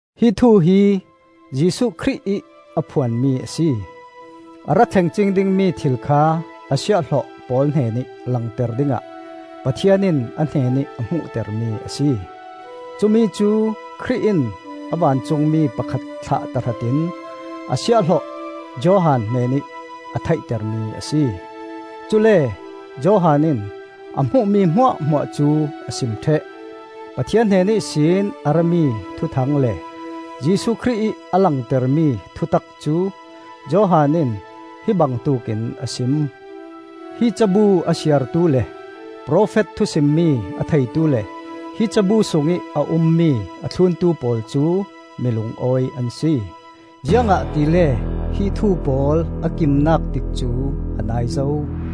Hi thu hi Jesuh Khrih ih a phuanmi a si. A ra thleng cing dingmi thil kha a siahhlawh pawl hnenih langter dingah Pathian in a hnenih a hmuhtermi a si. Cumi cu Khrih in a vancungmi pakhat thlah tahratin a siahhlawh Johan hnenih a theihtermi a si. Cule Johan in a hmuhmi hmuahhmuah cu a sim ṭheh. Pathian hnen ihsin a rami thuthang le Jesuh Khrih ih a langtermi thutak cu Johan in hi bangtuk in a sim. Hi cabu a siartu le profet thusimmi a theitu le hi cabu sungih a ummi a thluntu pawl cu mi lungawi an si. Ziangahtile hi thu pawl a kimnak tikcu a nai zo.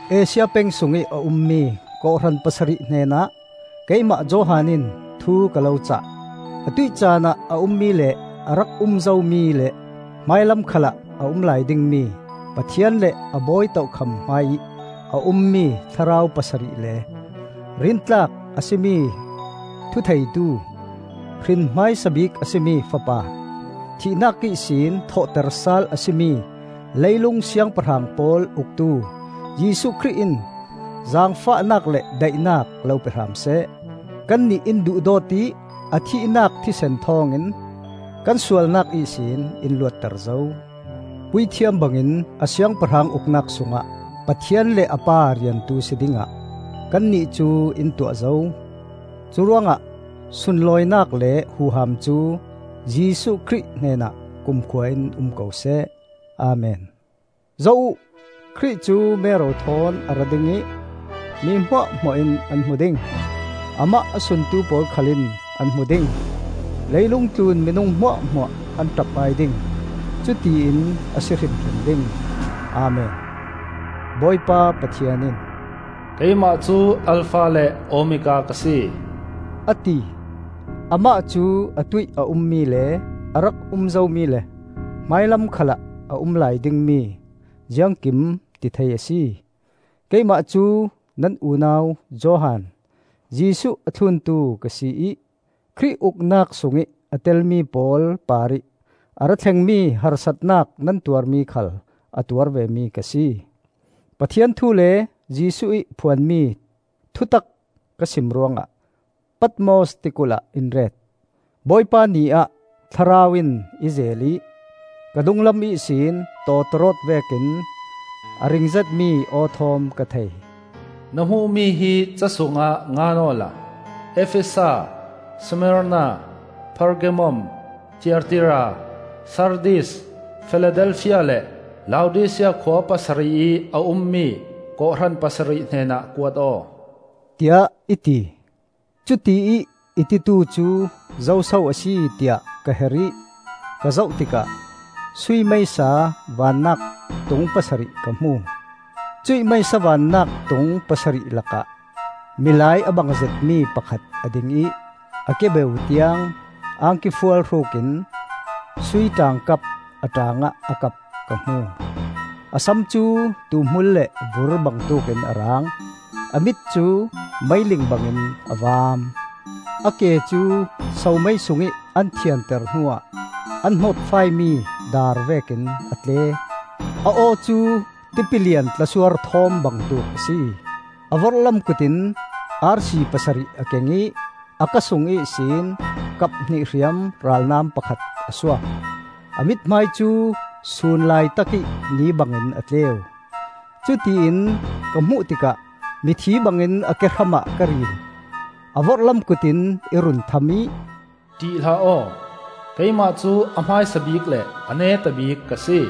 Asia peng sungih a ummi kawhhran pasarih hnenah keimah Johan in thu ka lo cah: Atuih canah a ummi le a rak um zomi le hmailam khalah a um lai dingmi Pathian le a bawi tokham hmaiih a ummi thlarau pasarih le, rintlak a si mi thutheitu, hrin hmaisa bik a si mi Fapa, thihnak ihsin thawhtersal a si mi leilung siangpahrang pawl uktu Jesuh Khrih in zaangfahnak le daihnak lo pe hram seh. Kannih in duhdawt ih a thihnak thisen thawngin kan sualnak ihsin in luatter zo. Puithiam bangin a siangpahrang uknak sungah Pathian le a Pa riantu si dingah kannih cu in tuah zo. Curuangah sunlawinak le huham cu Jesuh Khrih hnenah kumkhua in um ko seh. Amen. Zoh uh! Khrih cu mero thawn a ra ding ih mi hmuahhmuah in an hmu ding; amah a suntu pawl khal in an hmu ding. Leilung tlun minung hmuahhmuah an ṭap-ai ding. Cutiin a si hrimhrim ding. Amen. Bawipa Pathian in, “Keimah cu Alfa le Omega ka si,” a ti; Amah cu atuih a ummi le a rak um zomi le hmailam khalah a um lai dingmi Ziangkimtithei a si. Keimah cu nan unau Johan, Jesuh a thluntu ka si ih Khrih uknak sungih a telmi pawl parih a rathlengmi harsatnak nan tuarmi khal a tuar vemi ka si. Pathian thu le Jesuh ih phuanmi thutak ka sim ruangah Patmos tikulh ah in ret. Bawipa Ni ah Thlarau in i zeel ih ka dunglam ihsin tawtawrawt vekin a ring zetmi aw thawm ka thei. “Na hmuhmi hi ca sungah ngan awla Efesa, Smarna, Pergamum, Thiatira, Sardis, Filadelfia le Laodisia khua pasarih ih a ummi kawhhran pasarih hnenah kuat aw,” tiah i ti. Cutiih i titu cu zoso a si tiah ka her ih ka zoh tikah sui meisa vannak tung pasarih ka hmu. Cuih meisa vannak tung pasarih lakah milai a bang zetmi pakhat a ding ih a kebeu tiang angki fual hrukin sui ṭaangkap a ṭaangah a kap ka hmu. A sam cu tuuhmul le vur bangtuk in a rang. A mit cu meiling bangin a vaam. A ke cu somei sungih an thianter hnuah an hnawtfaimi dar vekin a tle. A aw cu tipilian tlasuar thawm bangtuk a si. A vorhlam kut in arsi pasarih a keng ih a ka sung ihsin kaphnih hriam ralnam pakhat a suak. A mithmai cu sun laitakih ni bangin a tleu. Cutiin ka hmuh tikah mithi bangin a kehram ah ka ril. A vorhlam kut in i run tham ih, “Ṭih hlah aw! Keimah cu a hmaisa bik le a neta bik ka si.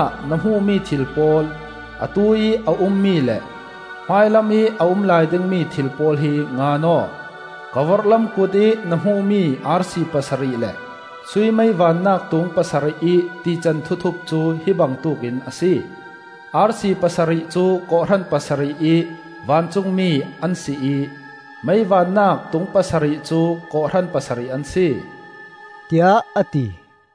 Curuangah na hmuhmi thil pawl, atuih a ummi le hmailamih a um lai dingmi thil pawl hi ngan aw. Ka vorhlam kutih na hmuhmi arsi pasarih le sui mei vannak tung pasarih ih tican thuthup cu hi bangtuk in a si. Arsi pasarih cu kawhhran pasarih ih vancungmi an si ih mei vannak tung pasarih cu kawhhran pasarih an si,” tiah a ti.